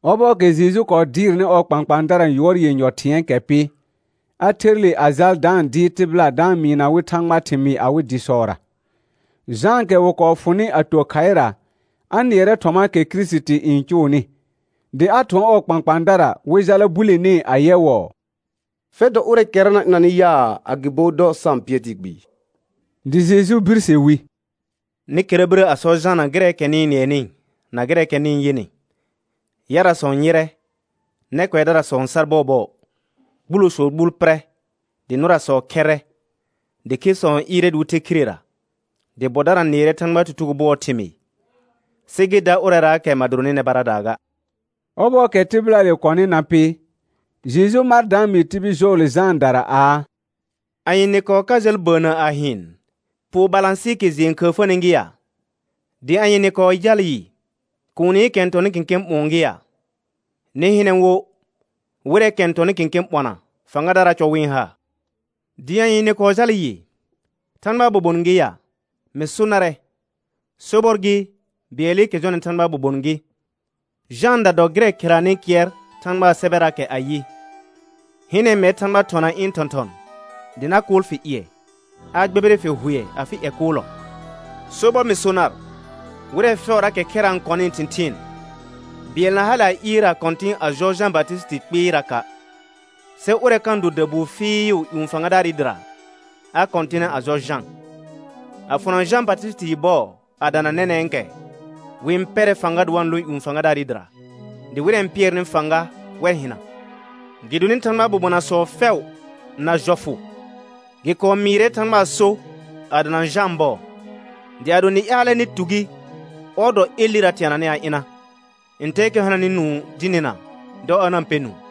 Ɔbɔɔkɛ Jeju kɔɔ dɩɩrnɩ ɔɔ kpãkpãadara yʋɔr yenyɔ thɩ̃ɛɛkɛ pɩ, a ther le a jal da-n dɩɩr tɩbɩla da-n mɩɩna wɩ Thãgbaa thɩmɩɩ awɩ dɩsɔra. Jãakɛ wɩ kɔɔ fʋnɩ a to khaɩra, a nɩɛrɛ thɔmaakɛ Kirisiti n cʋʋnɩ, dɩ a thʋɔn ɔɔ kpãkpãadara wɩ jala bulenee ayɛwɔɔ: Fɛr dɔ ʋrɛɛkɛra na ɩnanɩ yaa, agɩbo dɔ sa-n pɩɛr tɩɩ kpɩɩ? Dɩ Jeju birse wi: Nɩ kɛra birə a sɔ Jana gɩrɛɛkɛ nɩ-n nɩɛnɩ na gɩrɛɛkɛ nɩ-n yɩnɩ: Yarasɔ n yɩrɛ, nɛ kʋɛdarasɔ n sar bɔɔbɔɔ, gbulosɔɔ gbuul pɩrɛ, dɩ nʋrasɔ khɛrrɛ, dɩ khesɔ n ɩɩrɛ dɩ wɩ the khirera, dɩ bɔdara nɩɛrɛ Thãgbaa tutugo bʋɔɔ thɩmɩɩ. Sɩ gɩ da ʋrɛraakɛ ma doronɩ nɛ baradaa ga. Ɔbɔɔkɛ tɩbɩlaakɛ kɔnɩ na pɩ, Jeju mar da-n mɩɩ tibil jɔɔle Jãadara aa: Anye nɩ kɔɔ ka jal bəənnə a hɩɩn? Poo balãsɩɩkɛ jɩɛ n khəəfəni gɩ ya? Dɩ anye nɩ kɔɔ jal yɩ? Kuunikɛ n tɔnɩ kẽkẽ ɓʋ̃ɔ gɩ ya? Nɩ hɩnɛ wo wɩrɛɛkɛ n tɔnɩ kẽkẽ ɓɔna fãgadaraa cɔ wɩ-n ha. Dɩ anye nɩ kɔɔ jal yɩ? Thãgbaa bobon gɩ ya? Mɩ so narɛ, sobɔr gɩ, bɩɛlɩkɛ jɔnɩ Thãgbaa bobon gɩ. Jãada dɔ gɩrɛ kheranɩ kɩɛr Thãgbaa sɛbɛraakɛ ayɩ: «Hɩnɛ, mɛr Thãgba thɔna ɩ̃ thɔ̃thɔ̃, dɩ na kʋʋl fɩ ƴɩɛ, a gbɛbɩrɩ fɩ hʋɛ afɩ ƴɛ kʋʋlɔ.» Sobɔr mɩ so nar, wɩrɛ fɛʋraakɛ khɛra n kɔnɩɩ thɩ̃thɩɩn, bɩɛl na hale a ɩɩr a kɔ̃tɩ̃ a jɔ Jã Batɩsɩtɩ kpɩɩraka'. Sɩ ʋrɛ kanɩ do dabuu fɩɩʋ ƴũ fãgadaarɩ dɩra, a kɔ̃tɩnɛ a jɔ Jã. A fʋna Jã Batɩsɩtɩɩ bɔɔ a dana nɛnɛ̃kɛ, wɩ-n pɛrɛ fãga dɩ wa-n lõ ƴũ fãgadaarɩ dɩra, dɩ wɩrɛ n pɩɛrnɩ fãga, wɛr hɩna. Gɩdonɩ Thãgbaa bobonasɔ fɛʋ na jɔfʋ, gɩ kɔɔ mɩɩrɛ Thãgbaa so a dana Jãa bɔɔ. Dɩ ado nɩ ƴaalɛ nɩ tu gi, ɔr dɔ Elɩra teananɩ a ɩna. Ntɛɛkɛ hananɩ nũu dɩ nɩna, dɔ a na-n pɛ nũu.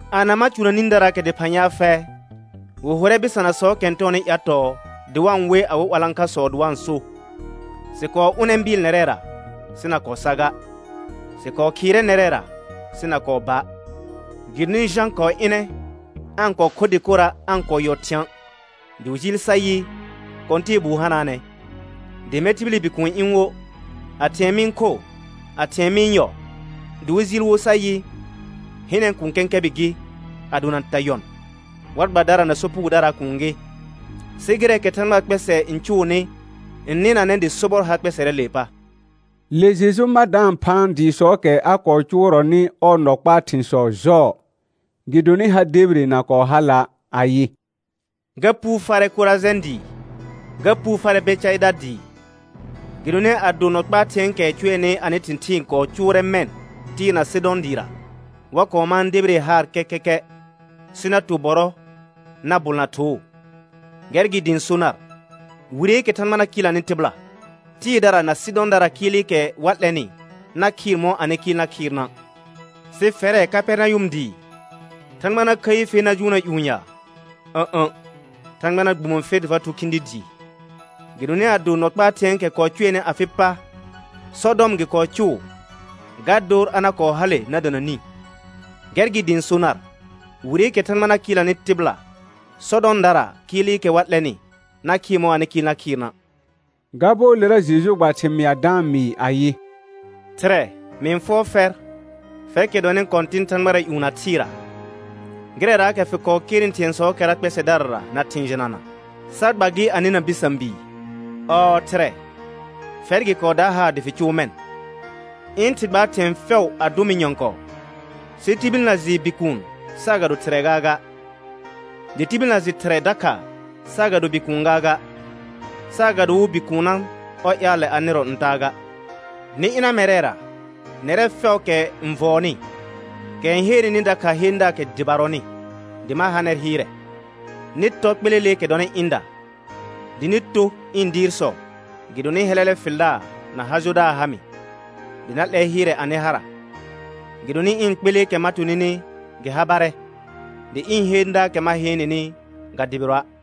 Ana ma cʋna nĩdaraakɛ dɩphã ya fɛ? Wɩ hʋrɛ bɩsanasɔɔkɛ n tɔɔnɩ ƴatɔɔ, dɩ wa-n we awɩ 'walãkhasɔ dɩ wa-n so: Sɩ kɔɔ ʋnɛ bɩɩl nɛrɛra, sɩ na kɔɔ sa ga, sɩ kɔɔ khɩɩrɛ nɛrɛra, sɩ na kɔɔ ba'. Gɩdonɩ Jã kɔɔ ɩnɛ, aa-n kɔɔ kho dɩkora', aa-n kɔɔ yɔ thɩ̃a', dɩ wɩ jɩɩl sa yɩ: Kɔ̃tɛɛbuu hanaanɛ. Dɩ mɛr tibili Bikuun ɩ̃ wo, a thɩ̃ɛ mɩ-n kho, a thɩ̃ɛ mɩ-n yɔ, dɩ wɩ jɩɩl wo sa yɩ: Hɩnɛ, kũu kɛ̃kɛbɩ gɩ, a dona ta yɔn, war gbadara na sopugodaraa kuun gɩ. Sɩ gɩrɛɛkɛ Thãgbaa kpɛsɛ n cʋʋnɩ n nɩnanɛ dɩ sobɔr har kpɛsɛrɛɛlee pa. Le Jeju ma da-n phaan dɩɩsɔɔkɛ a kɔɔ cʋʋrɔnɩ ɔɔ nɔ kpaa thɩ̃sɔ jɔɔ, gɩdonɩ ha debire na kɔɔ hala', ayɩ: Ga puu farɛ Korajɛ̃ dɩɩ, ga puu farɛ Bɛcaɩda dɩɩ, gɩdonɩ ado nɔ kpaa thɩ̃ɛɛkɛ cʋɛnɩ anɩ thɩ̃thɩɩn kɔɔ cʋʋrɛ mɛ̃ Tɩɩr na Sɩdɔ̃ dɩɩra, wa kɔɔ mãa debire haar kɛkɛkɛ, sɩ na to bɔrɔ na bʋlna thoo. Gɛr gɩ dɩ ɩ̃ so nar: Wireekɛ Thãgba na kɩɩlnanɩ tɩbɩla, Tɩɩrdara na Sɩdɔ̃daraa kɩɩlɩkɛ wa 'lɛnɩ na khɩɩr mɔ̃ anɩ kɩɩl na khɩɩrna'. Sɩ fɛrɛ Kapɛrnayʋm dɩɩ, Thãgba na khəi fer na jʋʋnna ƴũ ya? Ǝ̃'ə̃, Thãgba na gbumo fer dɩ fa thʋ khĩdi dɩɩ. Gɩdonɩ ado nɔ kpaa thɩ̃ɛɛkɛ kɔɔ cʋɛnɩ afɩ pa Sɔdɔm gɩ kɔɔ cʋʋ, ga dor a na kɔɔ hale na dana nĩ. Gɛr gɩ dɩ ɩ̃ so nar: Wireekɛ Thãgba na kɩɩlnanɩ tɩbɩla, Sɔdɔmdaraa kɩɩlɩkɛ wa 'lɛnɩ na khɩɩr mɔ̃ anɩ kɩɩl na khɩɩrna'. Ga bɔɔlera Jeju gba thɩmɩa da-n mɩɩ ayɩ: Thɩrɛ, mɩ-n fʋɔr fɛr, fɛrkɛ dɔnɩ Kɔ̃tɩn thãgbara ƴũ na thɩɩra, gɩrɛraakɛ fɩ kɔɔ kernɩ thɩ̃ɛsɔɔkɛra kpɛsɛdarara na thɩ̃ jɩnana, sa gba gɩ a nɩna bɩsã bii. Ɔɔ Thɩrɛ, fɛr gɩ kɔɔ da haar dɩ fɩ cʋʋ mɛ̃. Ɩ̃ Thɩ gbaar thɩ̃ɛ fɛʋ a dʋ mɩ nyɔ̃kɔɔ, sɩ tibil na jɩ Bikuun saagado Thɩrɛ gaaga, dɩ tibil na jɩ Thɩrɛ dakha saagado Bikuun gaaga, saagado wo Bikuunna ɔr ƴaalɛ a nɩrɔ n taa ga. Nɩ ɩna mɛrɛra, nɛrɛ fɛʋʋkɛ n vɔɔnɩ kɛ n heenenɩ dakha heendaakɛ dɩbarɔnɩ, dɩ ma ha nɛr hɩɩrɛ. Nɩ tɔ kpeleleekɛ dɔnɩ ɩ̃da, dɩ nɩ to ɩ̃ dɩɩrsɔ, gɩdonɩ hɛlɛlɛ fɩldaar na ha jodaar ha mɩ, dɩ na 'lɛr hɩɩrɛ anɩ hara. Gɩdonɩ ɩ̃ kpeleekɛ ma to nɩnɩ, gɩ habarɛ; dɩ ɩ̃ heendaakɛ ma heen nɩnɩ, ga dɩbɩrɔa'.